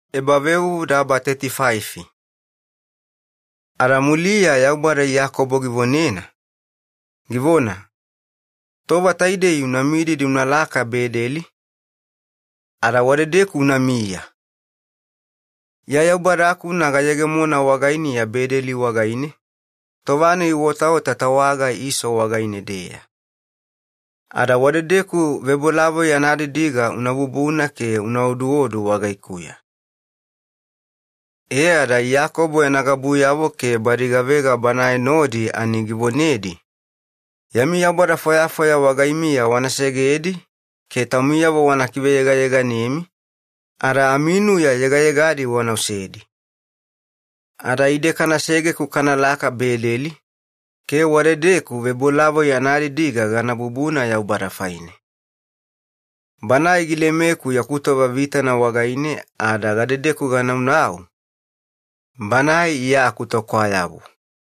Iyakobo giyewa Bedeli. Ada muliya Yaubada Iyakobo givonena, givona, “Tova taidei una mididi unalaka Bedeli, ada wadedeku unamiya. Iya Yaubada-kuna gayegemona wagainiya Bedeli wagaine tova-nai uotaota tawaga Iso wagaine-deya, e ada wadedeku ebavebolavoi anadidiga unabubuna ke una oduodu wagaikuya.” E ada Iyakobo yana gabuyavo ke badi gavega banae nodi ani givonedi, “Yami yaubada fwayafwaya wagaimiya wana segedi ke taumiyavo wana kiveyegayeganemi, ada aminuya yegayegadi wana osedi. Ada ide kanasege-ku kanalaka Bedeli, ke wadedeku Yaubada anaebaoduodu anadidiga gana bubuna, Banae gilemeku yaku tova vitana wagaine ada gadedeku ganaunau, Banae iya akutokwayabu.”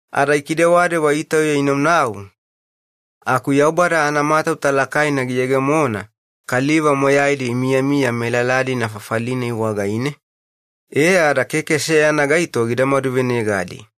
Ada ikidewadewa itauya inaunau aku Yaubada anamatauta lakaina giyegemona kaliva moyaidi imiyamiya melala-dina fafali-nai wagaine, e ada keke seyana gaito gida maduvenegadi.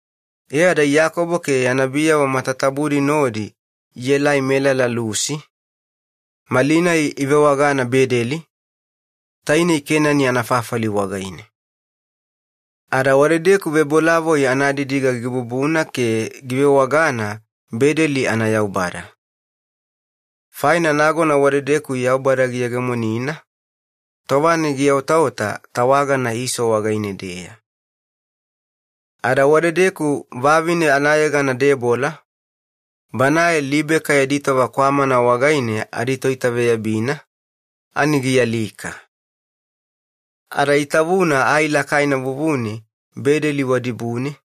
E ada Iyakobo ke yana biyavo matatabudi nodi ielai melala Lusi, malinai ivewagana Bedeli, Kenani anafafali wagaine. E ada ebavebolavoi anadidiga gibubuna ke givewagana ‘Bedeli ana Yaubada’. Faina nagona wadedeku Yaubada giyegemonina, tova-nai giotaota tawagana Iso wagaine-deya. Wadedeku vavine anayegana Debola banae Libeka yadi tova kwamana wagaine aditoitaveyabina, ani gialika. Ada itavuna ai lakaina vuvune Bedeli wadibune,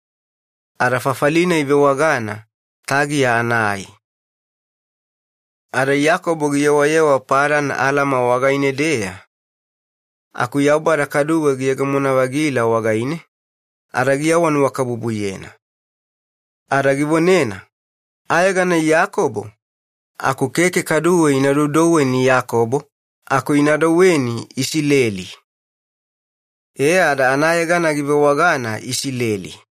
ada fafali-nai ivewagana ‘Tagiya ana Ai’. Ada Iyakobo giyewayewa Padan Alama wagaine-deya aku Yaubada kaduwe giyegemona-vagila wagaine ke giawanuwakabubuyena. Ada givonena, “Ayegana Iyakobo, aku keke kaduwe ina doudouweni Iyakobo, aku ina douweni Isileli.” E ada anayegana givewagana Isileli.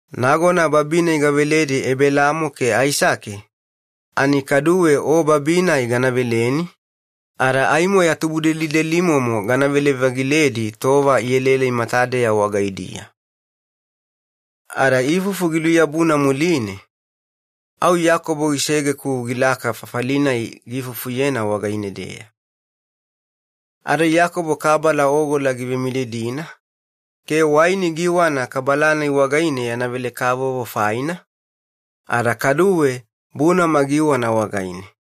Nagona babi-nai gaveledi Ebelaamo ke Aisake, ani kaduwe o babi-nai gana veleni ke aimo ya tubudelidelimomo ganavele-vagiledi tova ielaelai matadeya wagaidiya.” Ada ifufu giluyabuna muline au Iyakobo gisege-ku gilaka fafali-nai giifufuyena wagaine-deya. Ada Iyakobo kabala ogola givemididina ke waini giiwana kabala-nai wagaine yana vele-kavovo faina, ada kaduwe bunama giiwana wagaine.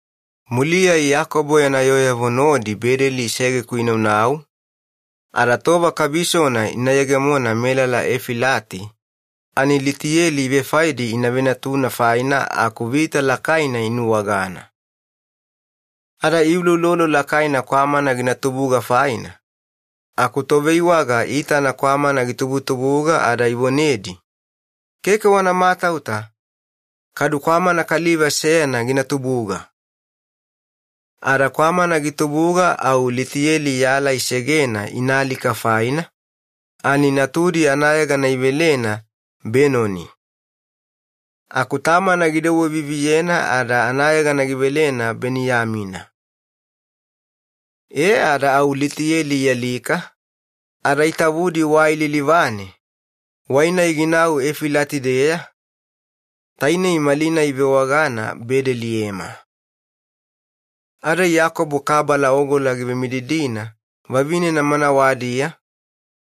Muliya Iyakobo yana yooyavo nodi Bedeli isege-ku inaunau ada tova kabisona ina yegemona melala Efilati, ani Litiyeli ivefaedi ina venatuna faina aku vita lakaina inuwagana. Ada iuloulolo lakaina kwamana gina tubuga faina, aku toveiwaga iitana kwamana gitubutubuga ada ivonedi, “Keke wana matauta, kwamana kaliva velugana gina tubuga.” Ada kwamana gitubuga au Litiyeli yala isegena inaalika faina ani natudi anayegana idouwena Benoni. Aku tamana gidouwe-viviyena ada anayegana givelena Beniyamina. E ada au Litiyeli ialika, ada itavudi wai lilivane, wai-nai ginau Efilati-deya, tainei malinai ivewagana Bedeliyema. Ada Iyakobo kabala ogola givemididina vavinena manawadiya,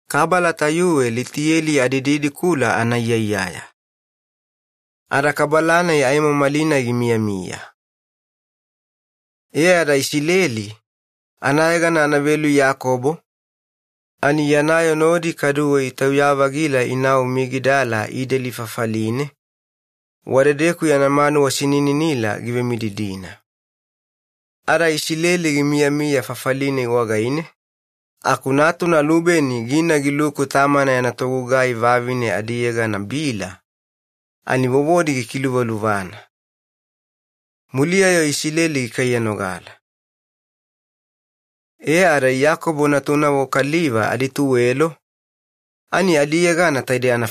kabala tayuwe Litiyeli adididikula anaiyaiyaya. Ada kabala-nai aimo malinai gimiyamiya. E ada Isileli, anayegana anavelu Iyakobo, ani yana yoo nodi kaduwe itauya-vagila inau Migidala Ideli fafaline, wadedeku yana manuwa sinininila givemididina. Ada Isileli gimiyamiya fafali-nai wagaine aku natuna Lubeni gina giluku tamana yana togugai vavine adiyegana Bila ani vovodi gikiluvaluvana. Muliya-yo Isileli gikaiyanogala. E ada Iyakobo natunavo kaliva adituwelo ani adiyegana: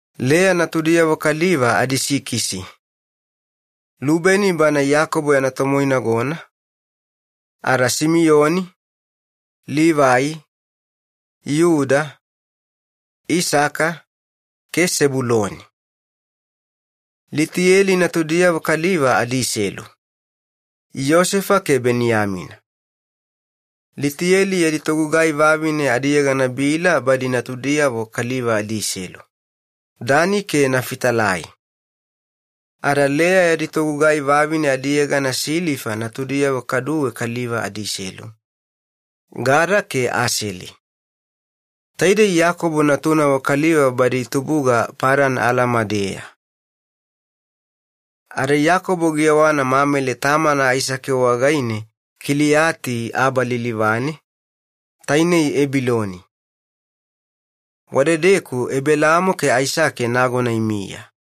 Leya natudiyavo kaliva adisikisi: Lubeni bana Iyakobo yana tomoinagona, ada Simiyoni, Livai, Yuda, Isaka ke Sebuloni. Litiyeli natudiyavo kaliva adiselu: Yosefa ke Beniyamina. Litiyeli yadi togugai vavine adiyegana Bila badi natudiyavo kaliva adiselu: Dani ke Nafitalai. Ada Leya yadi togugai vavine adiyegana Silifa natudiyavo kaduwe kaliva adiselu: Gada ke Aseli. Taidei Iyakobo natunavo kaliva badi itubuga Padan Alama-deya. Ada Iyakobo giyewana Mamele tamana Aisake wagaine Kiliyati Aba lilivane, tainei Ebiloni. Wadedeku Ebelaamo ke Aisake nagona imiya.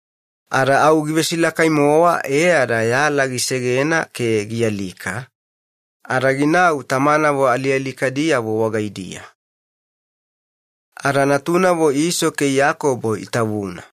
Ada au givesilakai-mowa e ada yala gisegena ke gialika ada ginau tamanavo alialikadiyavo wagaidiya. Ada natunavo Iso ke Iyakobo itavuna.